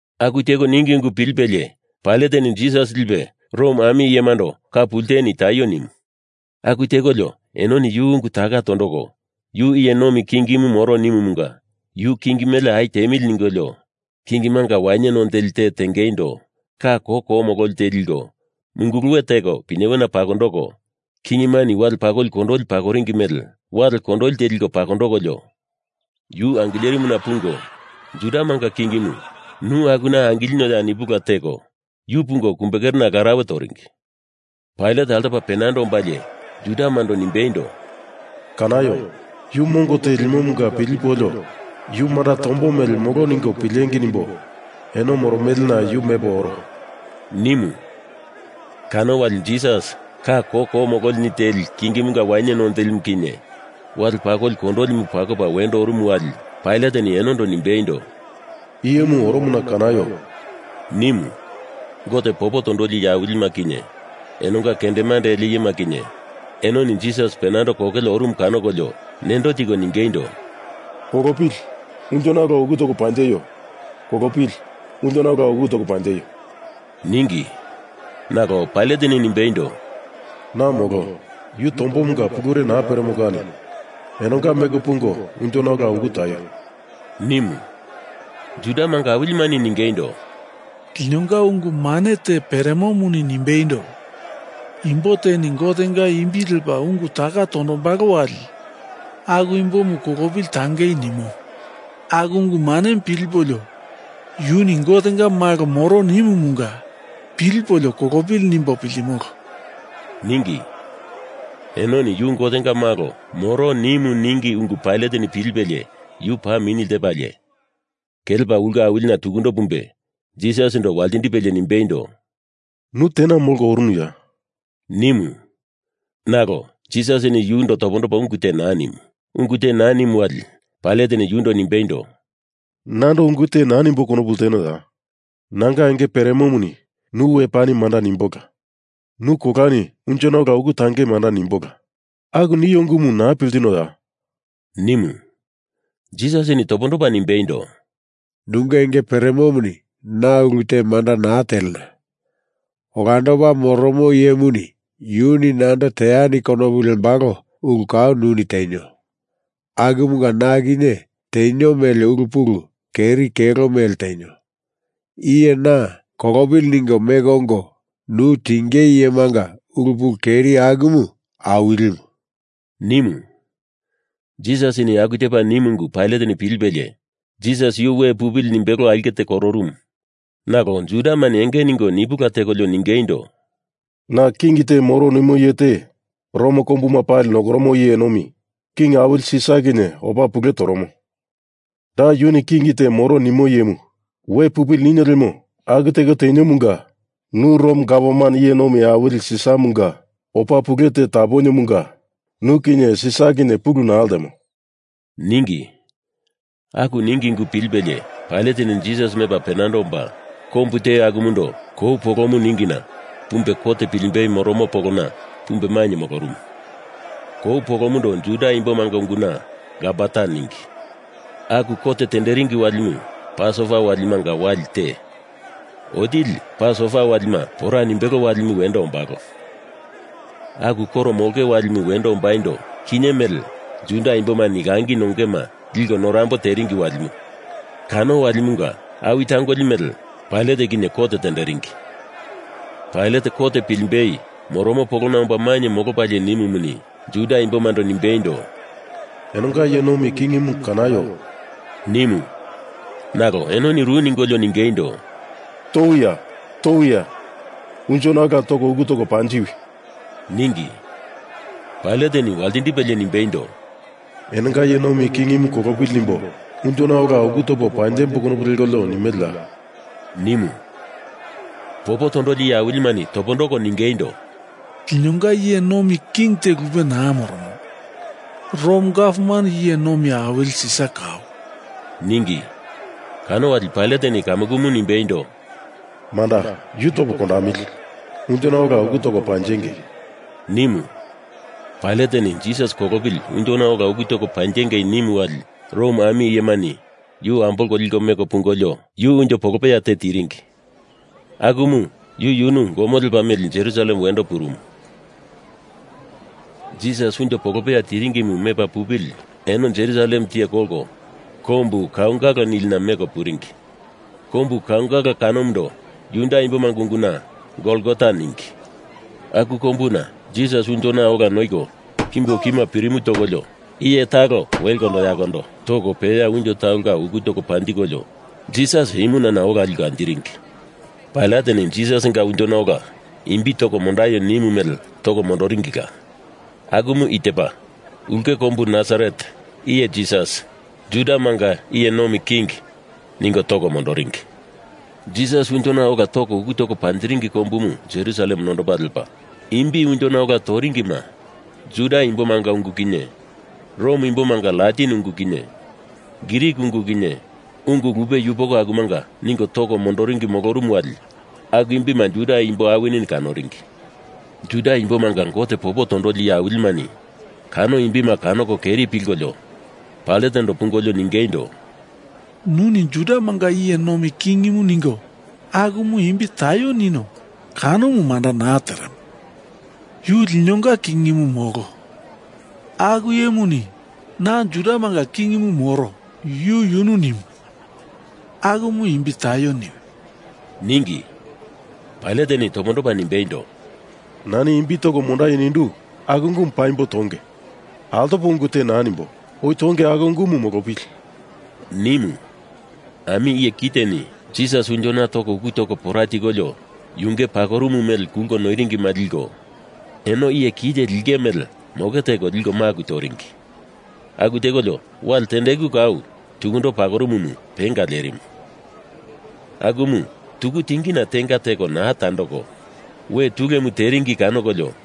Aku teko ningi ungu pilipelie Pailateni Jisas lipe Rom ami iyemando ka pulteni taio nimu. Aku tekolio enoni yu ungu taka tondoko yu iye nomi kingimu moro nimumunga yu king mele au tiemili ningolio, kingimanga wainye none teli te tengeindo ka koko mololi te liko munguluwe teko pinyewena pakondoko, kingimani wale pakoli kondoli pakoringi mele wale kondoli te liko pakondokolio yu angilerimuna pungo Judamanga kingimu, nu akuna angilinioya nipula teko, yu pungo kumbekerena larauwe toringi. Pailat altopa penando ombalie Judamando nimbeindo, “Kanaio! Yu mongo te limomunga pilipolio yu manda tombo mele molo ningo pilengei nimbo eno moromelena yu mepo oro,” nimu. Kano wali Jisas ka koko mololini teli kingimunga wainye none telimu kinye wale pakoli kondolimu pakopa wendo orumu wali Pailateni enondo nimbeindo, “Iyemu oromona kanaio!” nimu. Gote popo tondoli iye awilima kinye enonga kendemande ele iyema kinye enoni Jisas penando kokele orumu kanokolio nendo tiko ningeindo, “Kolopili! Unjona ola uku toko panjeio! Kolopili! Unjona ola uku toko panjeio!” ningi. Nalo Pailateni nimbeindo, “Na molo. Yu tombomunga pulure naa peremo kani enonga meko pungo unjona ola uku taio!” nimu. Judamanga awilimani ningeindo, “Linonga ungu mane te peremomuni nimbeindo, imbo teni Gotenga imbi lepa ungu taka tondombalo wali, aku imbomu kolopili tangei nimo, aku ungu manemu pilipolio yuni Gotenga Malo moro nimumunga pilipolio kolopili nimbo piltimolo,” ningi. Enoni yu Gotenga malo moro nimu ningi ungu Pailateni pilipelie yu paa mini ltepalie, kelepa ulke awilina tukundo pumbe Jisasindo waltindipelie nimbeindo, “Nu tena molko orunuya?” nimu, nalo Jisasini yundo topondopa ungu te naa nimu. Ungu te naa nimu wali Pailateni yundo nimbeindo, “Nando ungu te naa nimbo konopu ltenoya? Nanga enge peremomuni nu we pani manda nimbola, nu kolani unjona ola uku tangei manda nimbola. Aku nio ungumu naa piltinoya?” nimu. Jisasini topondopa nimbeindo, “Nunge enge peremomuni na ulu te manda naa telena. Olandopa Moromo Iyemuni yuni nando teani konopu lembalo ulu kau nuni tenio. Akumunga na kinye tenio mele ulu pulu keri kelo mele tenio. Iye na kolopili ningo meko ongo nu tingei iyemanga ulu pulu keri akumu awilimu,” nimu. Jisasini aku tepa nimu ungu Pailateni pilipelie Jisas yu we pupili nimbelo aulke te kororumu, nalo Judamani enge ningo nipula tekolio ningeindo, “Na king te moro nimo iye te Rom kombuma pali nokoromo iye nomi king awili Sisar kinye opa pule toromo. Da yuni king te moro nimo iyemu we pupili ninio lemo aku teko teniomunga nu Rom gavman iye nomi awili Sisaramunga opa pule te taponiomunga nu kinye Sisar kinye pulu naa ltemo,” ningi. Aku ningi ungu pilipelie Pailateni Jisas mepa penando omba, kombu te akumundo Kou Polomu ningina pumbe kot pilimbei moromo polona pumbe mainye molorumu. Kou polomundo Juda imbomanga unguna Gabata ningi. Aku kot tenderingi walimu Pasova Walimanga wali te, otili Pasova walima pora nimbelo walimu wendo ombalo. Aku koro molonge walimu wendo ombaindo, kinye mele Juda imbomani langi nongeima liko norambo teringi walimu kano walimunga awi tangoli mele, Pailat kinye kot tenderingi. Pailat kot pilimbei moromo polona omba mainye molopalie nimumuni, Juda imbomando nimbeindo, “Enonga iye nomi kingimu kanaio!” nimu. Nalo enoni ru ningolio ningeindo, “Towia! Towia! Unjona ola toko uku toko panjiwi!” ningi. Pailateni waltindipelie nimbeindo, “Enonga iye nomi kingimu kolopili nimbo unjona ola uku topo panjembo konopu lekolio nimeleya?” nimu. Popo tondoli iye awilimani topondoko ningeindo, “Linonga iye nomi king te lupe naa moromo. Rom gavman iye nomi awili Sisar kau,” ningi. Kano wali Pailateni kamukumu nimbeindo, “Manda, yu topo kondamili. Unjona ola uku toko panjengei!” nimu. Pailateni Jisas kolopili unjona ola uku toko panjenge nimu wali Rom ami iyemani yu ambolko liko meko pungolio yu unjo polopeya te tiringi, akumu yu yunu gomo lepa meli Jerusalem wendo purumu. Jisas unjo polopeya tiringimu mepa pupili eno Jerusalem tiye kolko Kombu Kaungala nilina meko puringi. Kombu Kaungala kanomundo Juda imbomanga unguna Golgota ningi. Aku kombuna Jisas unjona ola noiko kimbo kima pirimu tokolio iye talo wekondo yakondo toko peya unjo talonga uku toko panjikolio, Jisas imunana liko ola anjiringi. Pailateni Jisasinga unjona ola imbi toko mondaio nimu mele toko mondoringila. Akumu i tepa: ULKE KOMBU NASARET IYE JISAS, JUDAMANGA IYE NOMI KING ningo toko mondoringi. Jisas unjona ola toko uku toko panjiringi kombumu Jerusalem nondopa lepa, imbi unjona ola toringima Juda imbomanga ungu kinye Rom imbomanga Latin ungu kinye Grik ungu kinye, ungu lupe yupoko akumanga ningo toko mondoringi molorumu wali aku imbima Juda imbo awinini kanoringi. Juda imbomanga Gote popo tondoli iye awilimani kano imbima kanoko keri pilkolio Pailatendo pungolio ningeindo, “Nuni Judamanga iye nomi kingimu ningo akumu imbi taio ninio kanomu manda naa teremo. Yu linonga kingimu molo. Aku iyemuni na Judamanga kingimu moro yu yunu nimu. Akumu imbi taio niwi!” ningi. Pailateni topondopa nimbeindo, “Nani imbi toko mondaio nindu aku ungumu paimbo tonge. Altopo ungu te naa nimbo. Oi tonge aku ungumu molopili!” nimu. Ami iye kiteni Jisas unjona toko uku toko pora tikolio, yunge pakorumu mele kulko noiringima liko, eno iye kite lingei mele moke teko liko maku toringi. Aku tekolio wale tendeku kau, tukundo pakorumumu, penga lerimu. Akumu tuku tingina tenga teko naa tandoko we tulemu teringi kanokolio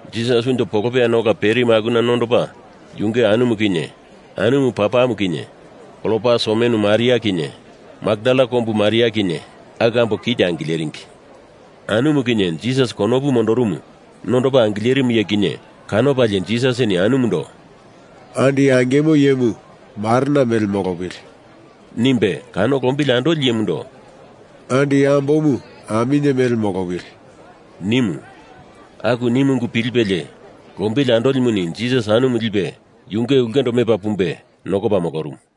Jisas unjo polopeyana ola perimu akuna nondopa yunge anumu kinye, anumu papamu kinye, Klopas omenu Maria kinye, Makdala kombu Maria kinye, aku ambo kite angileringi. Anumu kinye Jisas konopu mondorumu nondopa angilerimu iye kinye kanopalie Jisasini anumundo “Andi angimo iyemu marena mele molopili!” nimbe, kano lombili andoli iyemundo “Andi ambomu aminye mele molopili!” nimu. Aku nimu ungu pilipelie lombili andolimuni Jisas anumu lipe yunge ulkendo mepa pumbe nokopa molorumu.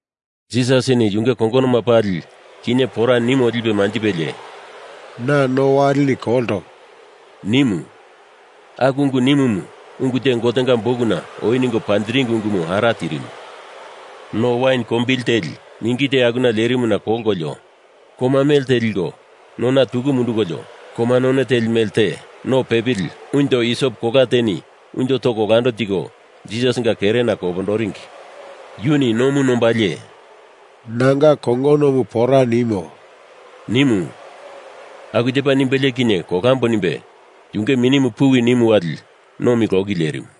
Jisasini yunge kongonoma pali kinye pora nimo lipe manjipelie “Na no waleni kolto,” nimu. Aku ungu nimumu ungu te Gotenga Bukuna oi ningo panjiringi ungumu ara tirimu. No wain kombili teli mingi te akuna lerimu kanokolio koma melte liko nona tuku mundukolio, koma none teli melte no pepili unjo isop kola teni unjo toko olando tiko Jisasinga kerena kopondoringi. Yuni nomu nombalie “Nanga kongonomu pora nimo,” nimu. Aku tepa nimbelie kinye kolambo nimbe yunge minimu puwi nimu wali nomi loki lerimu.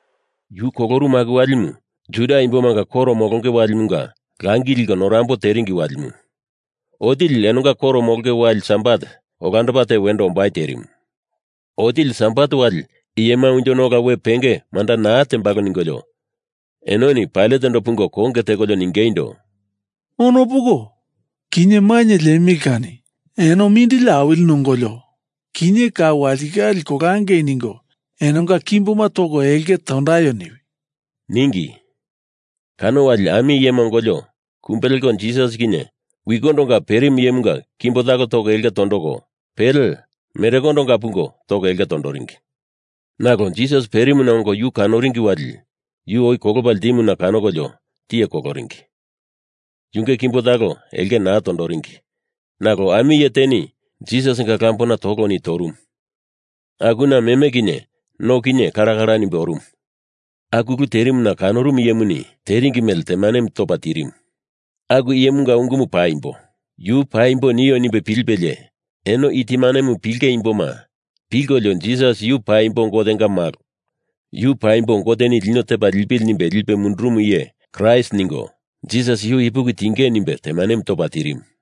Yu kolorumu aku walimu Juda imbomanga koro molonge walimunga langi liko norambo teringi walimu. Otili enonga koro mololi wali Sabat olandopa te wendo ombai terimu. Otili Sabat wali iyema unjona ola we penge manda naa tembalo ningolio enoni Pailatendo pungo konge tekolio ningeindo, “Ono poko, kinye mainye liemili kani eno mindili awili nongolio kinye kau walitikale kolangei ningo enonga kimboma toko elke tondaio niwi!” ningi. Kano wali ami iyema ongolio kumbe leko Jisas kinye wikondonga perimu iyemunga kimbo talo toko elke tondoko, pele merekondonga pungo toko elke tondoringi. Nalo Jisas perimuna ongo yu kanoringi wali yu oi kolopa ltimuna kanokolio tiye koloringi. Yunge kimbo talo elke naa tondoringi nalo ami iye teni Jisasinga lambona toloni torumu, akuna meme kinye no kinye kala kala nimbe orumu. Aku ulu terimuna kanorumu iyemuni teringi mele temanemu topa tirimu. Aku iyemunga ungumu paimbo. Yu paimbo nio nimbe pilipelie eno i temanemu pilinge imbomani pilkolio Jisas yu paimbo Gotenga Malo, Yu paimbo Goteni lino tepa lipili nimbe lipe mundurumu iye Kraist ningo Jisas yu ipuki tiengei nimbe temanemu topa tirimu.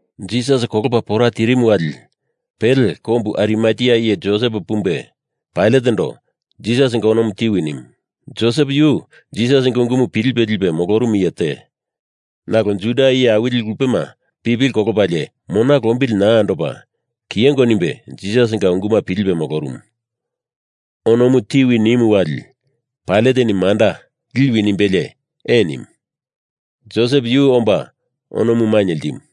Jisas kolopa pora tirimu wali pele kombu Arimatea iye Josep pumbe Pailatendo Jisasinga onomu tiwi nimu. Josep yu Jisasinga ungumu pilipe lipe molorumu iye te, nalo Juda iye awili lupema pipili kolopalie mona lombili naa andopa kiyengo nimbe Jisasinga unguma pilipe molorumu. Onomu tiwi nimu wali Pailateni manda, liwi nimbelie ee nimu. Josep yu omba onomu mainye ltimu.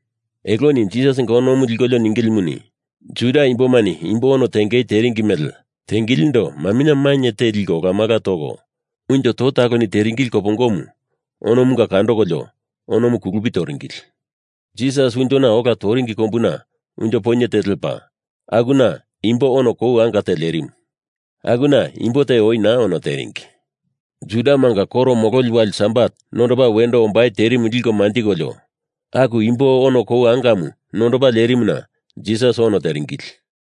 Eloni Jisasinga onomu likolio ningilimuni, Juda imbomani imbo ono tengei teremele mele tengilindo maminye mainye te liko olamala toko, unjo to taloni teringi kopongomu onomunga kandokolio onomu kulupi toringili. Jisas unjona ola toringi kombuna unjo poinye te lepa, akuna imbo ono kou anga te lerimu. Akuna imbo te oi naa ono teringi. Judamanga koro mololi wali Sabat nondopa wendo ombai terimu liko manjikolio aku imbo ono kou angamu nondopa lerimuna Jisas ono teringili.